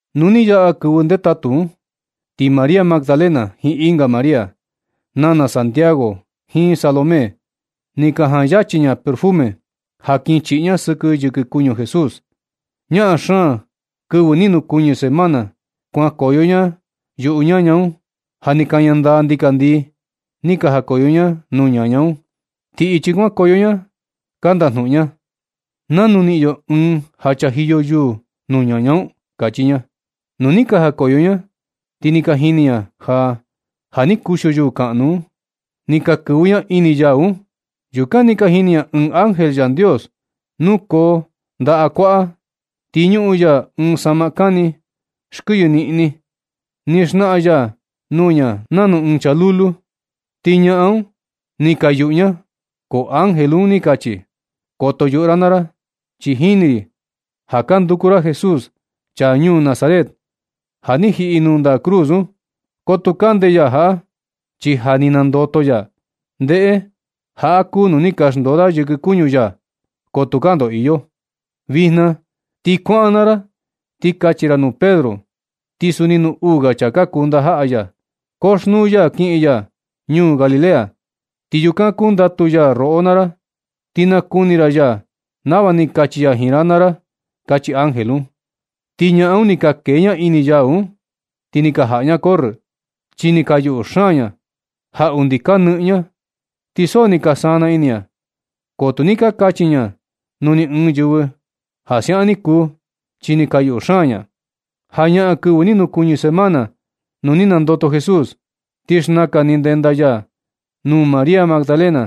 Nu ni yaꞌa kɨvɨ ndetatu un, ti María Magdalena jiin ɨnga María, nana Santiago, jiin Salomé, ni ka jaan yachi ña perfume ja kin chiꞌi ña sɨkɨ yɨkɨ kuñu Jesús. Ñaꞌan xaan kɨvɨ ni nukuñɨ semana kuankoyo ña yuꞌu ñaña un. Ja ni kaña ndaa ndikandii ni ka jakoyo ña nuu ñaña un. Ti ichi kuankoyo ña ka ndajnuꞌun ña: ―¿Nanu niꞌin yo ɨɨn ja chajiyo yuu nuu ñaña un? ―kachi ña. Nu ni ka jakoyo ña, ti ni ka jini ña ja, ja ni kuxio yuu kaꞌnu un. Ni ka kɨvɨ ña ini yau un. Yukan ni ka jini ña ɨɨn ángel Yandios nukoo ndaꞌa kuaꞌa. Ti ñuꞌun ya ɨɨn saꞌma kani, xkɨyɨ niꞌni. Ni naxnaꞌan ya nuu ña nanu ɨɨn chaa lulu. Ti ñaꞌan un ni ka yuꞌu ña. Ko ángel un ni kachi: ―Koto yuꞌu ra naa ra. Chi jini ri ja ka nanduku ra Jesús, chaa ñuu Nazaret ja ni jiꞌi nuu ndaꞌa cruz un. Ko tuu kande ya jaꞌa, chi ja ni nandoto ya. Ndeꞌe, jaꞌa kuu nuu ni ka xndoo da yɨkɨ kuñu ya, ko tukaa ndoo iyo. Vijna ti kuaꞌan naa ra ti kachi ra nuu Pedro, ti suni nuu uu ga chaa ka kuu ndajaꞌa ya: “Koxnuu ya kiꞌin ya ñuu Galilea, ti yukan kundatu ya roꞌo naa ra. Ti nakuni ra ya nava ni kachi ya jiin ra naa ra” ―kachi ángel un. Ti ñaꞌan un ni ka kee ña ini yau un, ti ni ka jaꞌa ña corrɨ, chi ni ka yuꞌu xaan ña ja undi ka nɨꞌɨn ña, ti so ni ka sana ini ña. Ko tu ni ka kachi ña nuu ni ɨɨn yɨvɨ ja siaꞌan ni kuu, chi ni ka yuꞌu xaan ña. Jañaꞌan kɨvɨ ni nukuɨñɨ semana, nu ni nandoto Jesús, ti xnakan ni ndenda ya nuu María Magdalena,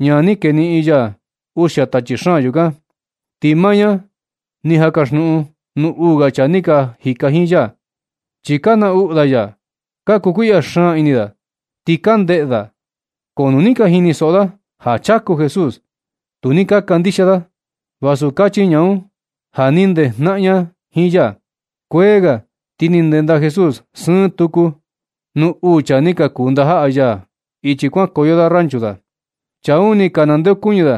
ñaa ni keniꞌin ya uxia tachi xaan yukan. Ti maa ña ni jan kaxnuꞌun nuu uu ga chaa ni ka jika jiin ya. Chi ka naꞌnu da ya, ka kukuiꞌya xaan ini da, ti ka ndeꞌe da. Ko nu ni ka jinisoꞌo da ja chaku Jesús, tu ni ka kandixia da, vasu kachi ña un ja ni ndejnaꞌan ña jiin ya. Kuee ga, ti ni ndenda Jesús sɨɨ tuku nuu uu chaa ni ka kuu ndajaꞌa ya ichi kuankoyo da ranchu da. Chaa un, ni ka nandeokuñɨ da,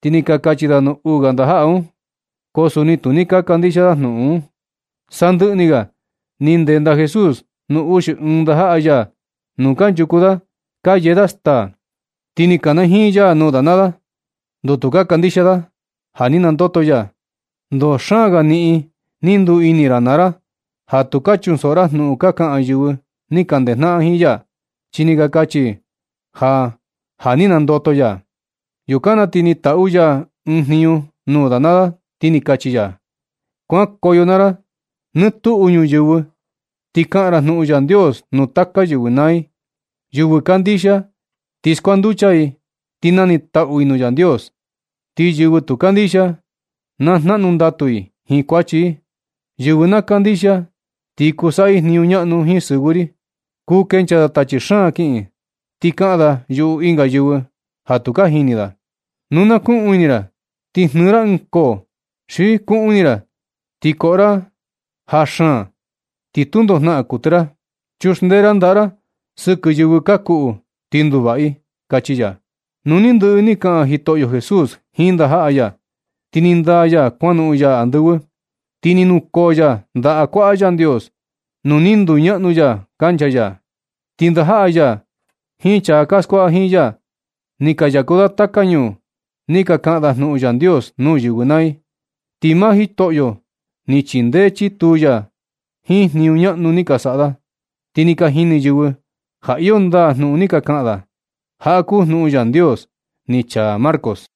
ti ni ka kachi da nuu uu ga ndajaꞌa un, ko suni tu ni ka kandixia da jnuꞌun un. Sandɨꞌɨ ni ga, ni ndenda Jesús nuu uxi ɨɨn ndajaꞌa ya nuu kanchuku da ka yee da staa. Ti ni kanajiin ya nuu da naa da, ndoo tu ka kandixia da ja ni nandoto ya, ndoo xaan ga niꞌin ni nduu ini ra naa ra ja tu ka chunsoꞌo ra jnuꞌun ka kaꞌan yɨvɨ ni ka ndejnaꞌan jiin ya, chi ni ka kachi i ja, ja ni nandoto ya. Yukan na ti ni taꞌu ya ɨɨn jniñu nuu da naa da, ti ni kachi ya: ―Kuankoyo naa ra nɨ tuꞌu ñuyɨvɨ, ti kaꞌan ra jnuꞌun Yandios nuu taka yɨvɨ naa i. Yɨvɨ kandixia, ti kuanducha i, ti nanitaꞌu i nuu Yandios. Ti yɨvɨ tu kandixia, na jnaꞌnu ndatu i jiin kuachi i. Yɨvɨ na kandixia ti kuu saꞌa i jniñu ñaꞌnu jiin sɨvɨ ri. Kuu kenchaa da tachi xaan kiꞌin. Ti kaꞌan da yuꞌu ɨnga yɨvɨ ja tu ka jini da. Nu na kuꞌuun ini ra ti jnɨɨ ra ɨɨn koo, xi kuꞌuun ini ra ti koꞌo ra veneno, ti tundo jnaꞌan kuɨtɨ ra. Chuxndee a ndaꞌa ra sɨkɨ yɨvɨ ka kuꞌu, ti nduvaꞌa i ―kachi ya. Nu ni ndɨꞌɨ ni kaꞌan Jitoꞌyo Jesús jiin ndajaꞌa ya, ti ni ndaa ya kuanoꞌon ya andɨvɨ. Ti ni nukoo ya ndaꞌa kuaꞌa Yandios nuu ni nduñaꞌnu ya kancha ya. Ti ndajaꞌa ya jiin chaa ka skuaꞌa jiin ya, ni ka yaku da taka ñuu ni ka kaꞌan da jnuꞌun Yandios nuu yɨvɨ naa i. Ti maa Jitoꞌyo ni chindee chituu ya da jiin jniñu ñaꞌnu ni ka saꞌa da, ti ni ka jini yɨvɨ ja iyo ndaa jnuꞌun ni ka kaꞌan da. Jaꞌa kuu jnuꞌun Yandios ni chaa Marcos.